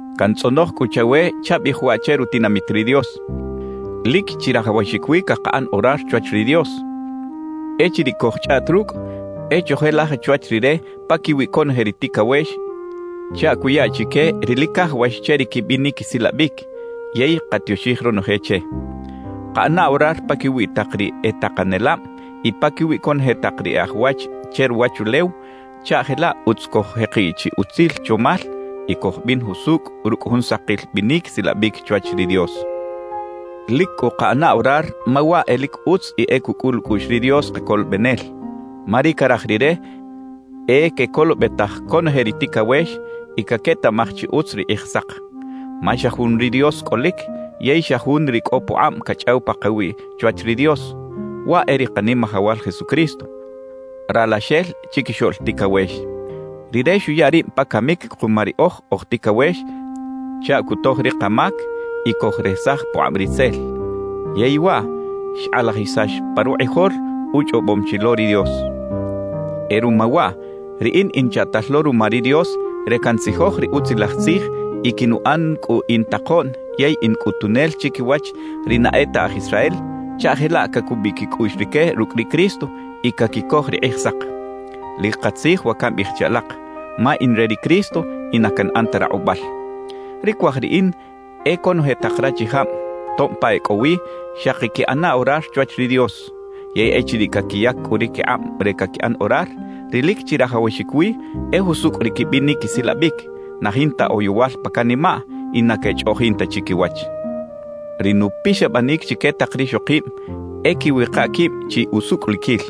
Cantzꞌonoj cꞌu chawe chabiꞌij waꞌ che rutinamit ri Dios: Lic chirajawaxic wi cakaꞌan orar chwach ri Dios. Echiriꞌ cojchꞌaꞌt rucꞌ, e chojelaj chwach Rire paquiwi conoje ri ticawex chaꞌ cuya chique ri lic cajawax che ri quibinic quisilabic, yey katioxij ronoje che. Kaꞌana orar paquiwi tak ri e takanelab y paquiwi conoje tak ri e aj wach che ruwachulew chaꞌ jelaꞌ utz coj-jekiꞌ chi utzil chomal y cojbin jusucꞌ rucꞌ jun sakil binic silabic chwach ri Dios. Lic cꞌu kaꞌana orar ma waꞌ e lic utz y e cucꞌul ucꞌuꞌx ri Dios Kacolobenel, ma ri caraj Rire e quecolobetaj conoje ri ticawex y caquetaꞌmaj chi utz ri Kꞌijsak. Ma xa jun ri Dios cꞌolic yey xa jun ri cꞌo pukꞌab cachꞌaw pakawiꞌ chwach ri Dios; waꞌ e ri Kanimajawal Jesucristo, Ralaxel Chiquixoꞌl Ticawex. Rire xuya rib pa camic kuma riꞌoj oj ticawex chaꞌ cutoj ri kamac y cojresaj pukꞌab Ritzel; yey waꞌ xkꞌalajisax pa rukꞌijol uchꞌobom chi lo ri Dios. E ruma waꞌ, riꞌin in chaꞌtal lo ruma ri Dios re cantzijoj ri Utzilaj Tzij y quinuꞌan cꞌu in takoꞌn yey in cꞌutunel chiquiwach ri na e ta aj Israel chaꞌ jelaꞌ cacubiꞌ quicꞌuꞌx rique rucꞌ ri Cristo y caquicoj ri Kꞌijsak. Lic katzij wa cambiꞌij che alak, ma in re ri Cristo y na canꞌan ta rakꞌubal. Ri cuaj riꞌin e conoje tak rachijab, tob pa e cꞌo wi, xaki quiꞌana orar chwach ri Dios. Yey echiriꞌ caquiyac cꞌu ri quikꞌab re caquiꞌan orar, ri lic chirajawaxic wi e jusucꞌ ri quibinic quisilabic, na jinta oyowal pa canimaꞌ y na quechꞌoꞌjin ta chiquiwach. Ri nupixabanic chique tak rixokib e quiwika quib chi usucꞌliquil.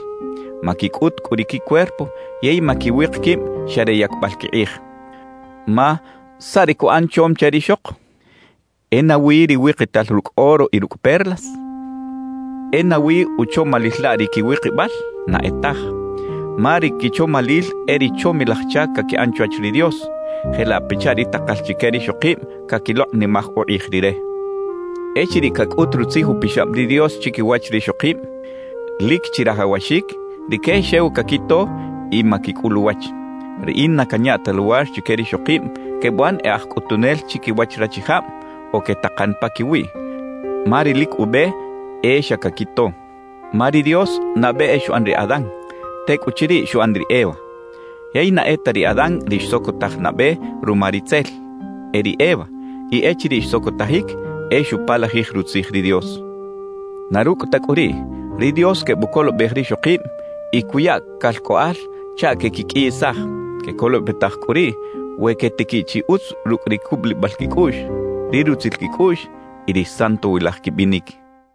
Maquicꞌut cꞌu ri quicuerpo yey maquiwik quib xa re yacbal quikꞌij. Ma ¿saꞌ ri cuꞌan chom che rixok? ¿E nawi ri wikital rucꞌ oro y rucꞌ perlas? ¿E nawi uchomalil laꞌ ri quiwikibal? Na e taj, ma ri quichomalil e ri chomilaj chac caquiꞌan chwach ri Dios, jelaꞌ pachaꞌ ri takal chique rixokib caquilokꞌnimaj ukꞌij Rire. Echiriꞌ cacꞌut Rutzij Upixab ri Dios chiquiwach rixokib, lic chirajawaxic rique xew caquito y maquicꞌul uwach. Riꞌin na canya ta luwar chique rixokib quebuꞌan e aj cꞌutunel chiquiwach rachijab o quetakan paquiwiꞌ; ma ri lic ube e xa caquito. Ma ri Dios nabe e xuꞌan ri Adán, tecꞌuchiriꞌ xuꞌan ri Eva. Yey na e ta ri Adán ri xsocotaj nabe ruma ritzel, e ri Eva; y echiriꞌ xsocotajic, e xupalajij rutzij ri Dios. Na rucꞌ ta cꞌu riꞌ, ri Dios quebucolobej rixokib y cuya calcꞌoꞌal chaꞌ quequiqꞌuiyisaj. Quecolobetaj cꞌu riꞌ we quetiquiꞌ chi utz rucꞌ ri cubulibal quicꞌuꞌx, ri rutzil quicꞌuꞌx y ri santowilaj quibinic.